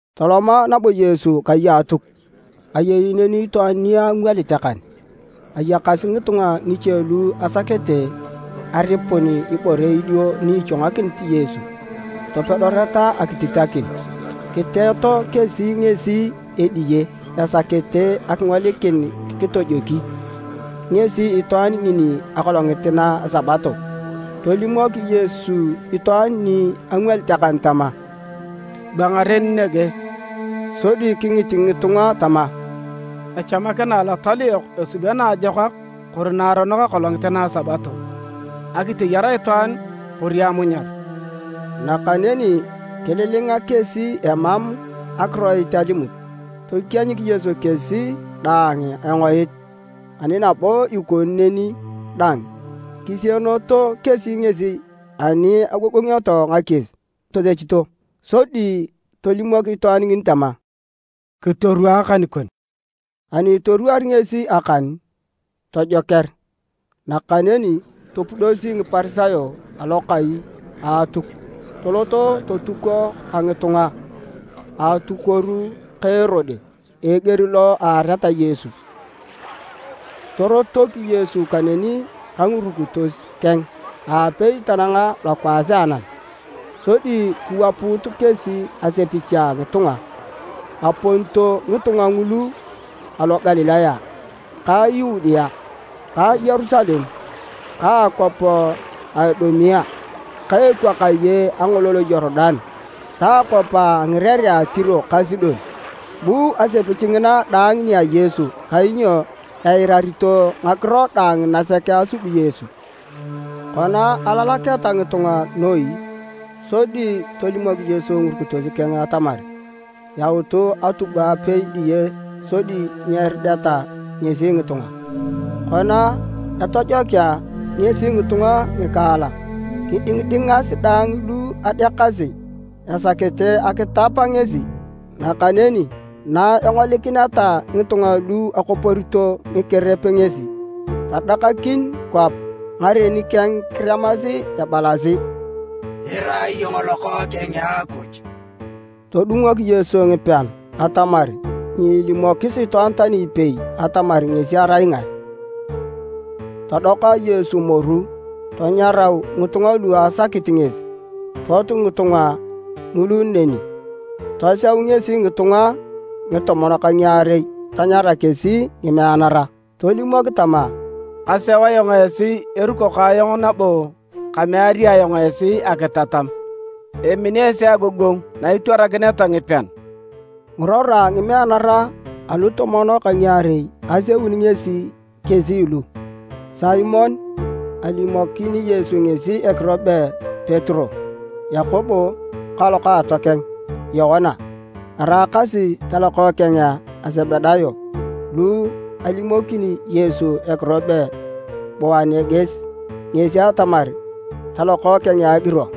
Toloma nabo Yesu kai a Atuk. Ayei neni itwaan ni angwalit akan. Ayakasi ngitunga ngiche lu asakete aripun ibore idio ni ichwangakini Yesu topedoreta akititakin, kiteto kesi ngesi ediye esakete akingolikin kitojoki ngesi itwaan ngini akolongit na a Sabato. Tolimok Yesu itwaan ni angwalit akan tama, “Bua ngaren nege.” Sodi kingit ngitunga tama, “Echamakina Alotal yok esubio naajokak kori naaronok akolongit na Sabato? Akiteyar itwaan kori amunyar?” Nakaneni kililinga kesi emam akiroit alimut. Tokienyik Yesu kesi daang engoit, ani nabo ikoni neni dang, kisieneto kesi ngesi ani agogongioto ngakies tosechito. Sodi tolimok itwaan ngini tama, “Kitorwaa akan kon.” Ani itorwaari ngesi akan, tojoker. Nakaneni topudosi Ngiparisayo Alokai a Atuk toloto totuko ka ngitunga a atukuor ka Erode eger lo eareta Yesu. Torotok Yesu kaneni ka ngirukitos keng aapei tananga lokwaas a anam sodi kiwapuut kesi asepich a ngitunga. Aponito ngitunga ngulu alo Galilaya ka Yudea, ka Yerusalem ka akwap a Idumea, ka ekwakaye a angolol a Yorudan ta akwap a ngirerea a Tiro ka Sidon. Bu asepich ngina daang nia Yesu kainyo eirarito ngakiro daang nasek asubi Yesu. Kona alalaketa ngitunga noi, sodi tolimok Yesu ngirukitos keng atamar yaut atubwa apei diye sodi nyerideta ngesi ngitunga. Kona etojokea ngesi ngitunga ngikaalak, kidingidingas daang lu adeakasi esakete akitap ngesi. Nakaneni na engolikineta ngitunga lu akoporito ngikerep ngesi, tadakakin kwap ngaren keng kiremasi ebalasi. “Irai iyong Lokookeng a Akuj!” Todungok Yesu ngipean atamar nyeelimokis itwaan tani ipei atamar ngesi arai ngae. Todoka Yesu moru, tanyarau ngitunga lu asakit ngesi. Pot ngitunga ngulu neni. Toseu ngesi ngitunga ngitomon ka ngiarei tanyara kesi ngimeanara. Tolimok tama, “Kaseu ayong esi eruko ka ayong nabo kameari ayong esi akitatam. Emini esi agogongu na itwarakineta ngipean.” Ngirora a ngimeanara alutomon ka ngiarei aseuni ngesi kesi lu: Simon (alimokini Yesu ngesi ekiro be Petero), Yakobo ka lokaatokeng Yoana, eraakasi talokookeng a Sebedayo lu alimokini (Yesu ekiro be Boaneriges, ngesi atamar, “Talokookeng a Agiro”),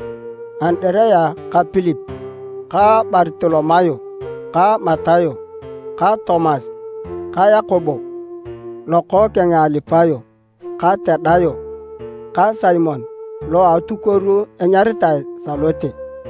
Andirea ka Pilip ka Bartolomayo ka Matayo ka Tomas ka Yakobo lokookeng a Alipayo ka Tadayo ka Simon lo a atukuor anyaritae Salote,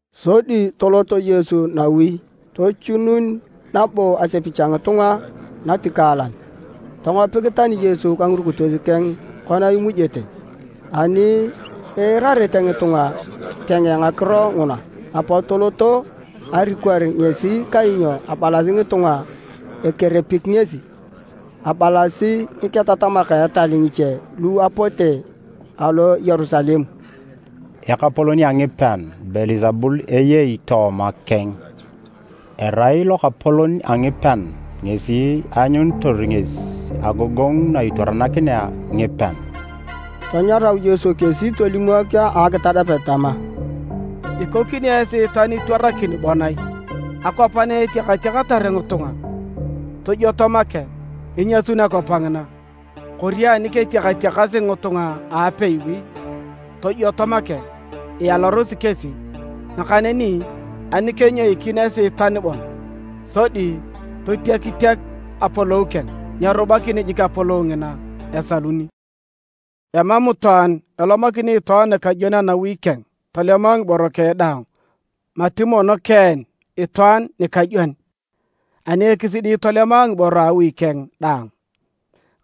Sodi tolot Yesu nawi. Tochunun nabo asepich a ngitunga natikaalan, tongopik tani Yesu ka ngirukitos keng kona imujete. Ani iirarete ngitunga keng ngakiro nguna apot toloto arikor ngesi kainyo abalasi ngitunga, “Ekerepik ngesi!” Abalasi ngiketatamak a etal ngiche lu apote alo Yerusalem, “Ekapolon a ngipean Beelsebul eyei tooma keng! Erai lokapolon a ngipean ngesi eanyunitor ngesi agogongu na itwarakinea ngipean.” Tanyarau Yesu kesi tolimok a ngakitadapet tama: “Ikokini Esiitan itwarakin bon ai? Akwap na etiakatiakatar ngitunga tojwoto make, inyasun akwap ngina. Kori ani ketiakatiakasi ngitunga apeiwi tojwoto make, ialarosi kesi. Nakaneni ani kenyoikin Esiitan bon, sodi totiakitiak apolou keng, nyerubakini jik apolou ngina, esaluni. “Emam itwaan elomakini itwaan nikajwon anawi keng tolema ngiboro keng daang mati mono keen itwaan nikajwon, ani ekisidi tolema ngiboro a awi keng daang.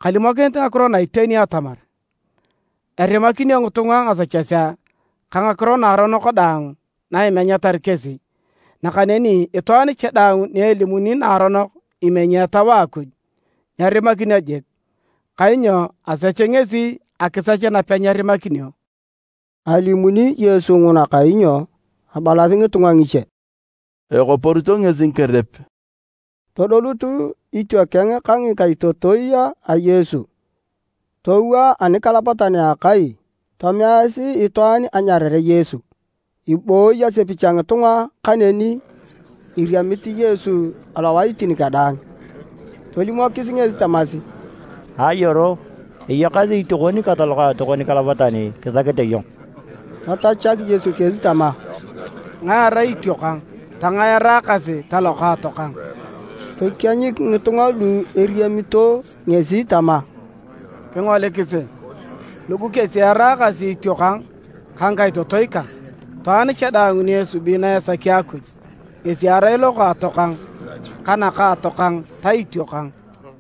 “Kalimokinit ngakiro na iteni atamar, erimakinio ngitunga ngasechesea ka ngakiro naaronok daang na imenyatar kesi. Nakaneni itwaan cha daang ni elimuni naaronok imenyi Etau a Akuj, nyerimakinio jik, kainyo asech ngesi akisech napenyerimakinio.” ( Alimuni Yesu nguna kainyo abalasi ngitunga ngiche, “Ekoporito ngesi ngikerep.”) Todolut itiokeng ka ngikaitotoi a Yesu, towaa anikalapatan a akai tomeasi itwaan anyarare Yesu. Ebooyi asepich a ngitunga kaneni eriamit Yesu alowaitin kadaang. Tolimokis ngesi tamasi, “Ayoro, eyakasi itiokon ka talokaatokon nikalapatan kisakete iyong.” Tatachak Yesu kesi tama, “Ngae erai itiokang, tangae eraakasi talokaato kang?” Tokienyik ngitunga lu eriamito ngesi tama, “Kingolikisi, lugu kesi eraakasi itiokang ka ngikaitotoi kang! Itwaan cha daang ni esubi na esaki Akuj, ngesi erai lokaatokang ka nakaatokang ta itiokang.”